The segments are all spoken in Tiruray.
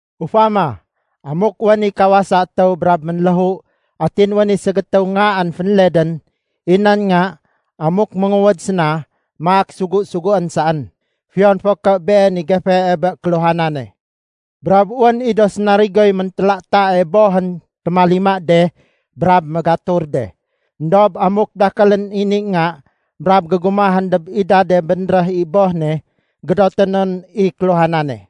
Ufama, amuk wén i kawasa étéw brab ménléhu atin wén i ségétéw ngaén fénledén. I nan nga, amuk ménguwéd séna, maak sugu-suguén saén, fiyon fo ké been i gefee bé kéluhanane. Brab wén i do sénarigoy méntélatae bohén témalima de brab mégatur de. Endob amuk dakélén i ni nga brab gégumahén dob idade bénréh i boh ne, gédoté non i kéluhanane.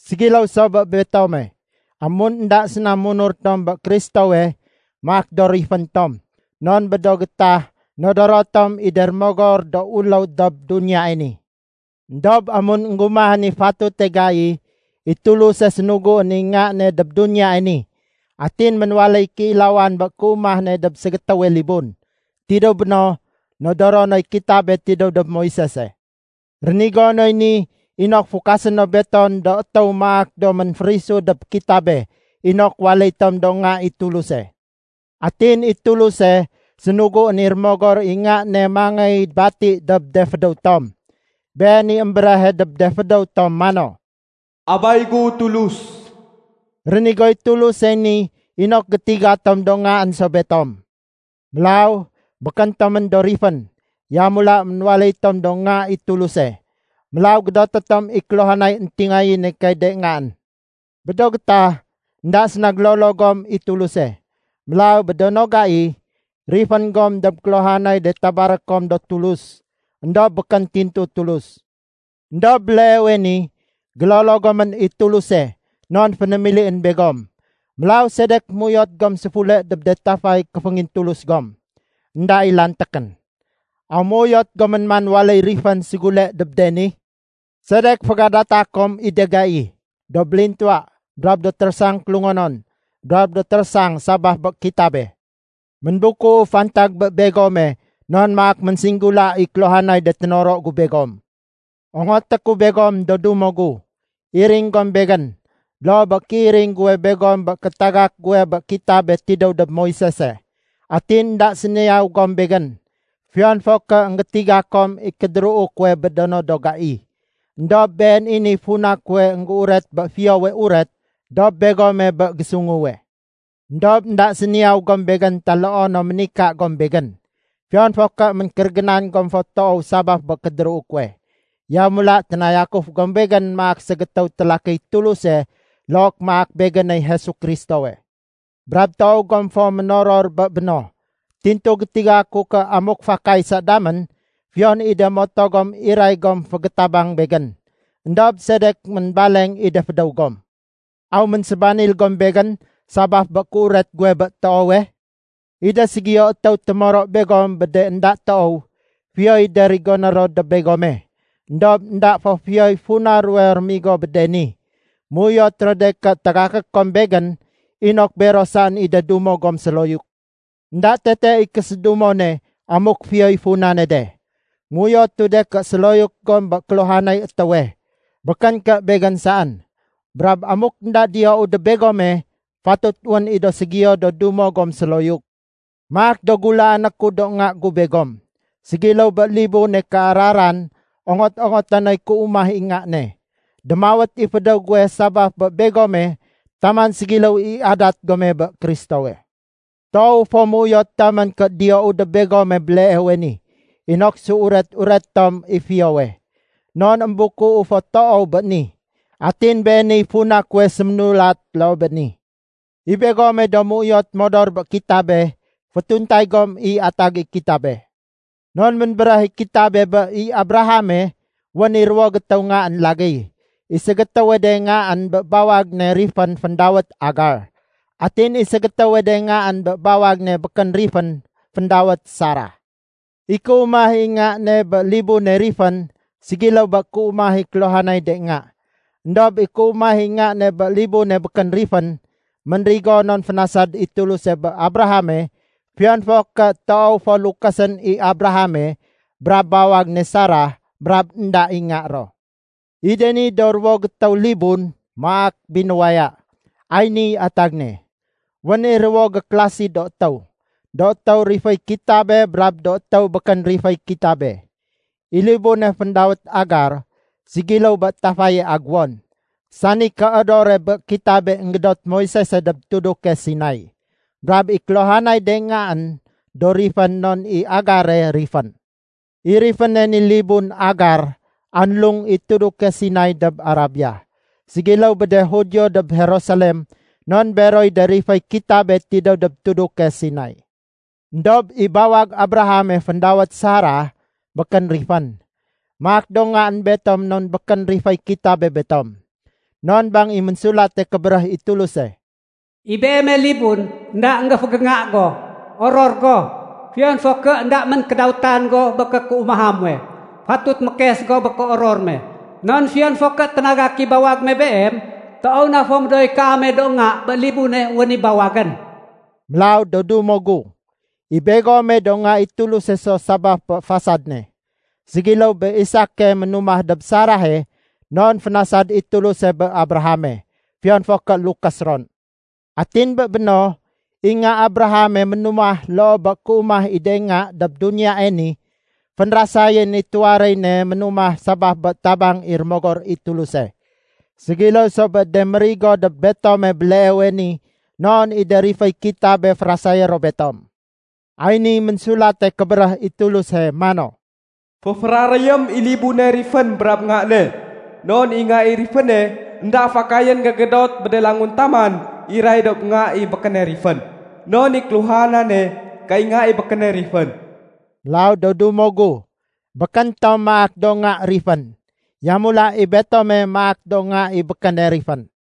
Ségiléw so bé betome, amun énda séna munur tom bé Kristowe, maak do rifén tom, non bé do gétah nodoro tom i de rémogor do uléw dob duniyae ni. Endob amun énggumahén i fatute gai, i Tuluse sénuguén i Nga ne dob duniyae ni. Atin ménwaléy kéilawan bé kéumah ne dob ségétéwe libun. Tidéw béno, nodoro noy kitabe tidéw dob Moisese. Rénigo noy ni inok fukasé no betom do étéw maak do ménférisu dob kitabe inok waléy tom do nga i Tuluse. Atin i Tuluse sénuguén i Rémogor i Nga ne mangéy bati dob de fédéw tom. Been i émbéréhe dob de fédéw tom mano, “Abay gu Tulus”. Rénigoy Tulusey ni inok gétiga tom do ngaén so betom. Mélaw békén tomén do rifén, yamula ménwaléy tom do nga i Tuluse. Mélaw gédoté tom i kéluhanay éntingayéne kay de ngaén. Bé do gétah, énda séna gélolo gom i Tuluse. Mélaw bé do no gai, rifén gom dob kéluhanay de tabaré kom do tulus, éndob békén tintu Tulus. Endob béleewe ni, gélolo gomén i Tuluse non fénémilién begom. Mélaw sedek méuyot gom séfule dob de tafay kéféngintulus gom, énda i lantékén? Aw méuyot gomén man waléy rifén ségule dob de ni? Sedek fégadata kom i de gai, do bélintuwa brab do térésang kélungonon brab do térésang sabaf bé kitabe? Ménbukuu fantag bé begome non maak ménsinggula i kéluhanay de ténoro gu begom. Ongoté ku begom do dumo gu, iring gom begén, loo bé kéiring guwe begom bé kétagak guwe bé kitabe tidéw dob Moisese. Atin énda séniyaw gom begén, fiyon fo ké énggétiga kom i kédéruu kuwe bé do no do gai. Endob been i niy funa kuwe énggéuret bé Fiyowe Uret dob begome bé gésunguwe. Endob énda séniyaw gom begén taloo no ménika gom begén, fiyon fo ké ménkérégénan gom fo toow sabaf bé kédéruu kuwe. Yamula ténayakuf gom begén maak ségétéw télakiy Tuluse look maak begéney Jesu Kristowe. Brab toow gom fo ménoror bé béno. Tintu gétiga ku ké amuk fakay sa damén, fiyon i de moto gom iray gom fégétabang begén. Endob sedek ménbaleng i de fédéw gom? Aw ménsébanil gom begén sabaf bé kéuret guwe bé toowe? I de ségiyo étéw témoro begom bé de énda toow, fiyoy de rigoné ro dob begome, éndob énda fo fiyoy funa ruwe rémigo bé de ni. Méuyot ro de ké tagaké kom begén inok bero saén i de dumo gom séloyuk. Enda tete i késédumone amuk fiyoy funane de. Méuyotu de ké séloyuk gom bé kéluhanay étéwe, békén ké begén saén. Brab amuk énda diyou dob begome, fatut wén i do ségiyo do dumo gom séloyuk. Maak do gulaané ku do nga gu begom. Ségiléw bé libune kéararan ongot-ongoté noy kéumah i nga ne, démawét i fédéw guwe sabaf bé begome taman ségiléw i adat gome bé Kristowe. Toowu fo méuyot damén ké diyou dob begome béleewe ni, inok séuret-ureté tom i fiyowe. Non émbukuu fo toow béni. Atin beeniy funa kuwe sémulat loo bé ni. I begome do méuyot modor bé kitabe, fétuntay gom i atag i kitabe. Non ménbéréh i kitabe bé i Abrahame wén i ruwo gétéw ngaén lagéy. I ségétéwe de ngaén bé bawag ne rifén féndawét Agar, atin i ségétéwe de ngaén bé bawag ne békén rifén féndawét Sarah. I kéumah i nga ne bé libune rifén ségiléw bé kéumah i kéluhanay de nga. Endob i kéumah i nga ne bé libune békén rifén, ménrigo non fénasad i Tuluse bé Abrahame fiyon fo ké toow fo lukésén i Abrahame brab bawag ne Sarah brab énda i nga ro. I de ni do ruwo gétéw libun maak binuwaya. Ay niy atag ne. Wén i ruwo gékélasi do étéw, do étéw riféy kitabe brab de étéw békén riféy kitabe. I libune féndawét Agar, ségiléw bé tafaye aguwon, sani kéodore bé kitabe énggédot Moisese dob tuduke Sinai. Brab i kéluhanay de ngaén, do rifén non i Agare rifén. I riféne ni libun Agar anlung i tuduke Sinai dob Arabia, ségiléw bé de Judio dob Jerusalem non beroy de riféy kitabe tidéw dob tuduke Sinai. Endob i bawag Abrahame féndawét Sarah békén rifén. Maak do ngaén betom non békén riféy kitabe betom. Non bang i Ménsulate Kébéréh i Tuluse, “I beeme libun énda énggéfégénga go, oror go! Fiyon fo ké énda ménkédawétan go bé kékéumaha muwe, fatut mékes go bé kéoror me! Non fiyon fo ké ténagak i bawag me beem, toow na fo médooy kaame do nga bé libune wén i bawagén.” Mélaw do dumo gu, i begome do nga i Tuluse so sabaf bé fasad ne, ségiléw bé Isake ménumah dob Sarahe non fénasad i Tuluse bé Abrahame, fiyon fo ké lukés ron. Atin bé béno, i nga Abrahame ménumah loo bé kéumah i de nga dob duniyae ni, fénrasayén i tuwaréy ne ménumah sabaf bé tabang i Rémogor i Tuluse. Ségiléw so bé de mérigo dob betome béleewe ni non i de riféy kitabe férasayé ro betom. Ay niy Ménsulate Kébéréh i Tuluse mano, “Féféraréyém i libune rifén brab nga ne, non i nga i riféne énda fakayén gégédot bé de languntaman iray dob nga i békéne rifén. Non i kéluhanane kay nga i békéne rifén.” Mélaw, do dumo gu, békén tom maak do nga rifén. Yamula i betome maak do nga i békéne rifén.